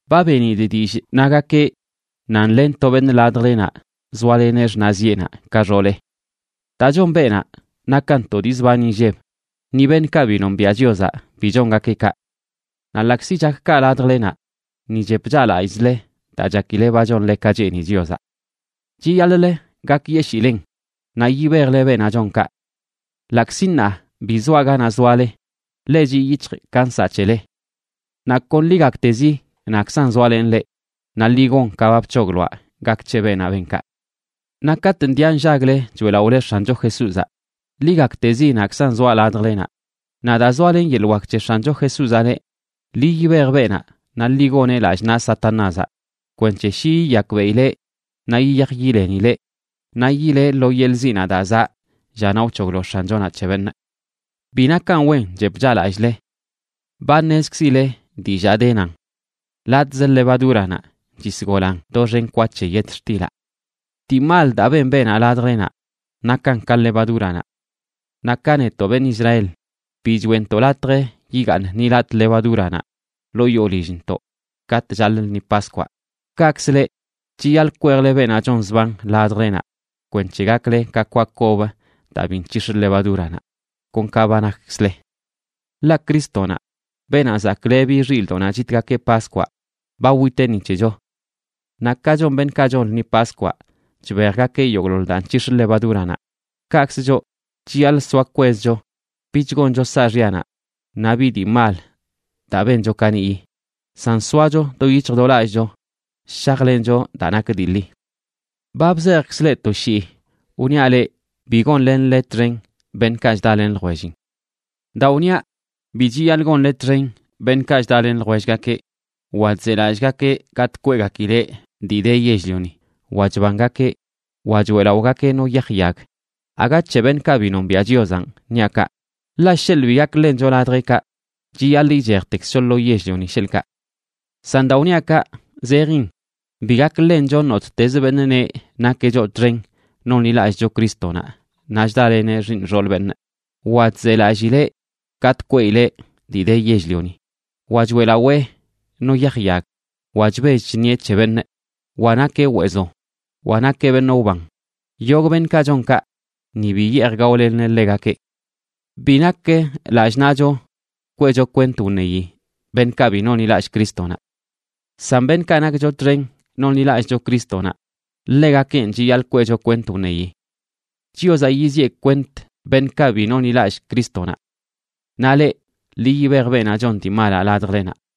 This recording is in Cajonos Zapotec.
Ba benidꞌ dillꞌ nagakeꞌ nan len to beṉꞌ ladjlenaꞌ zoaleneꞌ xṉaꞌziꞌenaꞌ ka xooleꞌ. Daa chon beenaꞌ nakan to dii zban inlleb; ni beṉꞌkaꞌ bi nombiaꞌ Chiozaꞌ bi chongakeꞌ kaꞌ. Naꞌ ḻaꞌkzi chak kaꞌ ladjlenaꞌ, ni chep chaꞌlallꞌzle daa chakile ba chonle ka cheeni Chiozaꞌ. Chiyaḻꞌlə gakyeshilen naꞌ yibejle beenaꞌ chon kaꞌ. Ḻaꞌkzi ṉaa bi zoaꞌ ganaꞌ zoale, ḻe chiꞌ yic̱hjꞌ ka nsaꞌ c̱hele. Naꞌ kon ḻi gaktezi naꞌkzan zoalenꞌ leꞌ, naꞌ ḻi gon ka ba bc̱hogloaꞌ gak c̱he beenaꞌ ben kaꞌ. Naꞌ katꞌ ndiꞌa nllagle choeꞌlaꞌole X̱ancho Jesúzaꞌ, ḻi gaktezi naꞌkzan zoaꞌ ladjlenaꞌ, naꞌ daa zoalen yeḻꞌ wak c̱he X̱ancho Jesúzaꞌ leꞌ, ḻi yibej beenaꞌ naꞌ ḻi goneꞌ lallꞌ naꞌ Satanázaꞌ kwenc̱he shi yiyakbeꞌileꞌ naꞌ yiyaj yilenileꞌ naꞌ yileꞌ lo yeḻꞌ ziꞌnaꞌ daa zaꞌ llanaꞌ wc̱hoglo X̱anchonaꞌ c̱he beṉꞌ. Bi nakan wen chep chaꞌlallꞌle. Ba ṉezkzile dillaa de nan: “Latꞌz levadúranaꞌ chisgolan doxen kwa c̱he yetxtilaꞌ.” Dii mal daa ben beenaꞌ ladjlenaꞌ nakan ka levadúranaꞌ. Naꞌ ka netoꞌ beṉꞌ Israel bi choeꞌntoꞌ latj yigaaṉ ni latꞌ levadúranaꞌ ḻoo yoo lillntoꞌ katꞌ chaḻꞌ lṉi Paskwaꞌ, kaꞌkzə leꞌ chiyaḻꞌ kwejle beenaꞌ chon zban ladjlenaꞌ kwenc̱he gakle ka kwa kob daa bi nc̱hix̱ levadúranaꞌ, kon ka ba nakkzle. Ḻaꞌ Crístonaꞌ, beenaꞌ zaklebi xilꞌdoꞌnaꞌ chitgakeꞌ Paskwaꞌ, ba witeꞌ ni c̱hecho. Naꞌ ka chon beṉꞌkaꞌ chon lṉi Paskwaꞌ chbejgakeꞌ yogꞌḻoḻ daa nc̱hix̱ levadúranaꞌ, kaꞌkzə choꞌ chiyaḻꞌ soa kwezcho bich goncho saaxyanaꞌ naꞌ bi dii mal daa bencho kaniꞌyi, san soacho do yic̱hj do lallꞌcho shajlencho daa nak dii ḻi. Ba bzejkzꞌ leꞌ to shii wniaꞌ leꞌ bi gonlenle txen beṉꞌkaꞌ chdalen ljwellin. Daa wniaꞌ bi chiyaḻꞌ gonle txen beṉꞌkaꞌ chdalen ljwellgakeꞌ, wa chzelallꞌgakeꞌ gatꞌ kweꞌgakileꞌ dii de yell-lioni, wa chbangakeꞌ, wa choeꞌlaꞌogakeꞌ no yaj yag, aga c̱he beṉꞌkaꞌ bi nombiaꞌ Chiozanꞌ niaꞌ kaꞌ, ḻaꞌ sheḻꞌ bi gak ḻencho ladjeꞌkaꞌ chiyaḻꞌ ichejtekzcho lo yell-lioni, sheḻꞌkaꞌ. San daa wniaꞌ kaꞌ zejin bi gak ḻencho nottezə beṉꞌ neꞌ nakeꞌ choꞌ txen nonḻilallꞌcho Crístonaꞌ naꞌ chdaleneꞌ xiiṉ xool beṉꞌ, wa chzelallileꞌ gatꞌ kweꞌileꞌ dii de yell-lioni, wa choeꞌlaꞌoweꞌ no yaj yag, wa chbell chṉieꞌ c̱he beṉꞌ, wa nakeꞌ weezo, wa nakeꞌ beṉꞌ wban. Yogꞌ beṉꞌkaꞌ chon kaꞌ, ni bi yeej gaolenle ḻegakeꞌ. Bi nak lallꞌ naꞌcho kweꞌcho kwent wṉeyi beṉꞌkaꞌ bi nonḻilallꞌ Crístonaꞌ. San beṉꞌkaꞌ nakcho txen nonḻilallꞌcho Crístonaꞌ, ḻegakenꞌ chiyaḻꞌ kweꞌcho kwent wṉeyi. Chiozaꞌ yiziꞌe kwent beṉꞌkaꞌ bi nonḻilallꞌ Crístonaꞌ. Naꞌ leꞌ, ḻi yibej beenaꞌ chon dii malaꞌ ladjlenaꞌ.